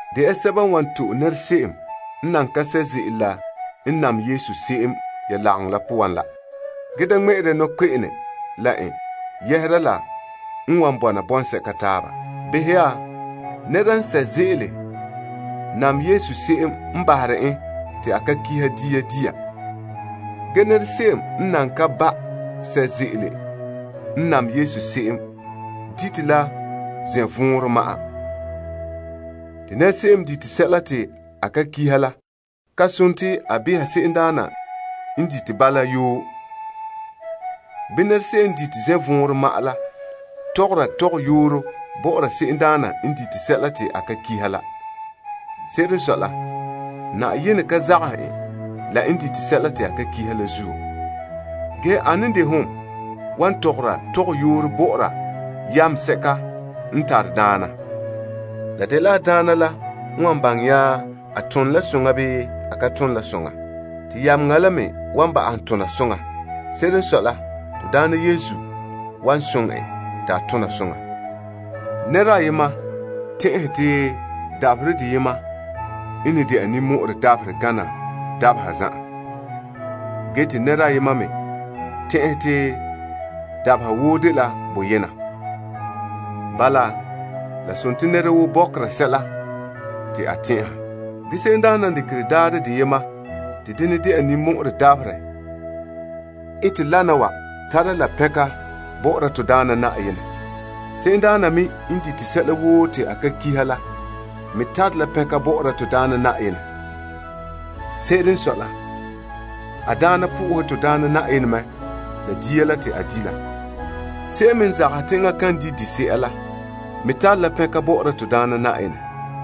De ya sɛba n wan to'e nɛra se'em n nan ka sɛ' ze'ele la n nam Yesu se'em ya lagaŋɔ poan la. Ge da ŋmɛ'ɛre ya nɔkpe'ene la ba yɛhera la n wan bɔna bɔŋsɛka taaba. Behɛ ya, te nɛra n sɛ' ze'ele n nam Yesu se'em n bahere en te a ka kihi dia dia. Ge nɛra se'em n nan ka ba' sɛ' ze'ele n nam Yesu se'em, dite la zɛnvɔɔnrɔ ma'an. Nɛra se'em n ka kihi dia dia la, da behɛ se'emdaana n ka dite bala la yoo. Bii nɛra se'em n dite zɛnvɔɔnrɔ ma'an la tɔgɔra tɔgɔyooro bɔ'ɔra se'emdaana n dite sɛla te a ka kiha la. Se'ere n sɔe la, Yenɛ ka zagahɛ en la n dite sɛla te a ka kiha la zuo. Ge ane n de hom wan tɔgɔra tɔgɔyooro bɔ'ɔra yameŋa sɛka n tare daana? La dela a daana la n wan baŋɛ nya a tone la soŋa bii a ka tone la soŋa. Te yameŋa la me wan ba'ahom tona la soŋa. Se'ere n sɔe la, to Daana wan soŋɛ en te a tona soŋa. Nɛra ayema tɛn'ɛhe te dabaherɛ deyena n ne de'a ninmɔ'ɔrɛ dabaherɛ gana dabeha zan'an. Ge te nɛra ayema me tɛn'ɛhɛ te dabeha woo dela boyena. Bala, la dela nɛra woo bɔkera sɛla te a tɛn'ɛha. Se'emdaana n dekerɛ daarɛ deyema te denɛ de'a ninmɔ'ɔrɛ dabaherɛ ete wana wa tara la pɛnka bɔ'ɔra to Daana Na'ayenɛ. Se'emdaana me n dite sɛla woo te a ka kiha la me tare la pɛnka bɔ'ɔra to Daana Na'ayenɛ. Se'ere n sɔe la, a daana pɛngɛ to Daana Na'ayenɛ mɛ la dia la te a di' la. Se'em me n zagahɛ te enŋa kan di' dise'a la, me tare la pɛnka bɔ'ɔra to Daana Na'ayenɛ.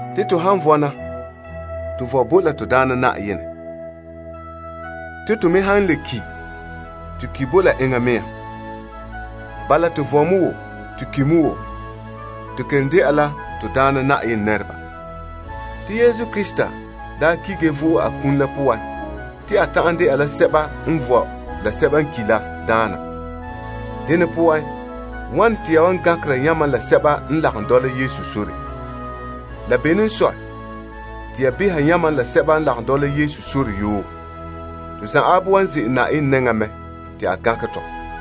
Te to han vɔna, to vɔe bo la to Daana Na'ayenɛ. Te to me han le ki, to ki bo la enŋa mea. Bala, to vɔe mɛ woo, to ki mɛ woo, to kelom de'a la to Daana Na'ayenɛ nɛreba. Te Krista daa ki ge vo'e a kum la poan te a ta'an dɛna sɛba n vɔe la sɛba n ki la Na'ayenɛ. Dene poan, wane te ya gankera yamam la sɛba n lagom dɔla Yesu sore? La bene n sɔe te ya beha yamam la sɛba n lagom Yesu sore yoo? To zanwaabe wan ze'ele Yenɛ nɛŋan te a gankɛ tɔ.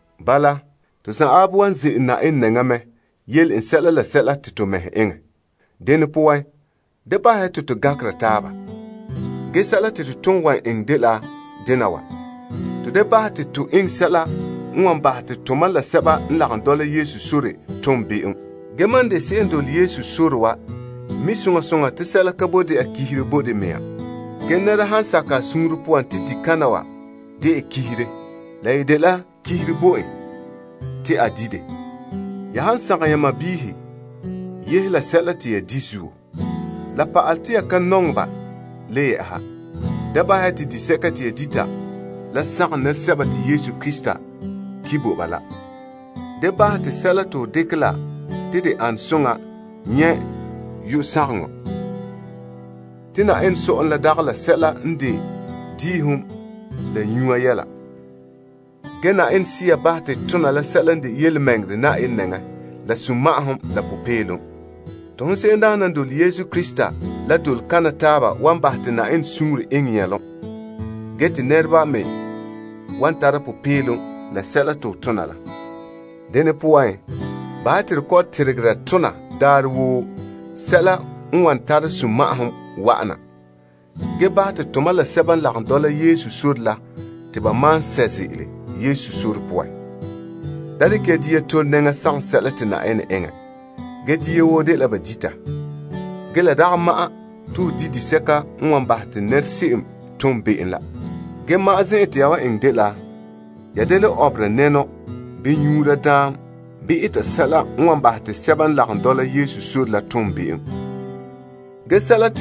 Bala, to zanwaabe wan ze'ele Yenɛ nɛŋan yele n sɛla la sɛla te to mɛhe eŋɛ. Dene poan, bahɛ ya te to da gankera taaba. Ge sɛla te to ton wan eŋɛ dela to da eŋɛ sɛla n wan bahɛ te to taaba ton be'em. Ge mam n de se'em n dole Yesu sore wa, mi' soŋa soŋa te sɛla ka boe dɛna kihire bo de mea te ba di dɛ. Ge nɛra han sakɛ a suunre poan te disɛka dɛna kihire, la yi dela kihire bo en te a di dɛ. Ya han sagom ya sɔɔnrɔ yɛhera la sɛla te ya di zuo, la pa'alɛ te ya ka nɔŋɛ ba le yɛ'ɛha. Da bahɛ ya te disɛka te ya dita la sagom nɛresɛba te Yesu Krista ki bo ba la. Da bahɛ te sɛla te ho dekɛ la te de ane soŋa nyɛ' yu'urɛ sagaŋɔ. Te Yenɛ sɔ'ɔlom la dagɛ la sɛla n de diihom la nyuya yɛla. Ge Yenɛ Sea bahɛ te to tona sɛla n de tontɔɔ Yenɛ nɛŋan, la sunma'ahom, la popeelom. Te hon se'emdaana n dole Yesu Krista la, dole kana taaba wan bahɛ te Yenɛ suunre eŋɛ nyɛlom. Ge te nɛreba me wan tara popeelom la sɛla te ho tona la. Dene poan, bahɛ ya te to kɔ'ɔn tegera tona daarɛ woo sɛla n wan tare sunma'ahom wa'ana, ge bahɛ te tomam la sɛba n lagom dɔla Yesu sore la te ba malom sɛ' ze'ele Yesu sore la poan. Da dekɛ ya dia te'e nɛŋa sagom sɛla te Yenɛ eŋɛ. Ge dia woo dela ba dita, ge la dagɛ ma'an te ho di disɛka wan bahɛ te nɛra se'em tom be'em la. Ge ma'an zen'an te ya wan eŋɛ dela ya ye da le ɔbera nɛnɔ bii nyuura daam bii eta sɛla n wan bahɛ te sɛba n lagom dɔla Yesu sore la tom be'em la.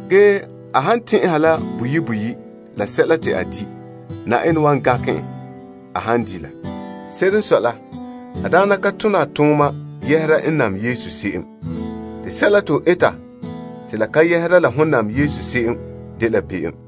Ge a han tɛn'ɛha la boyi' boyi' la sɛla te a di', Yenɛ wan gankɛ en a han di' la. Se'ere n sɔe la, a daana ka tone a tooma yɛhera n nam Yesu se'em. Te sɛla te ho eta te la ka yɛhera la ho nam Yesu se'em dela be'em.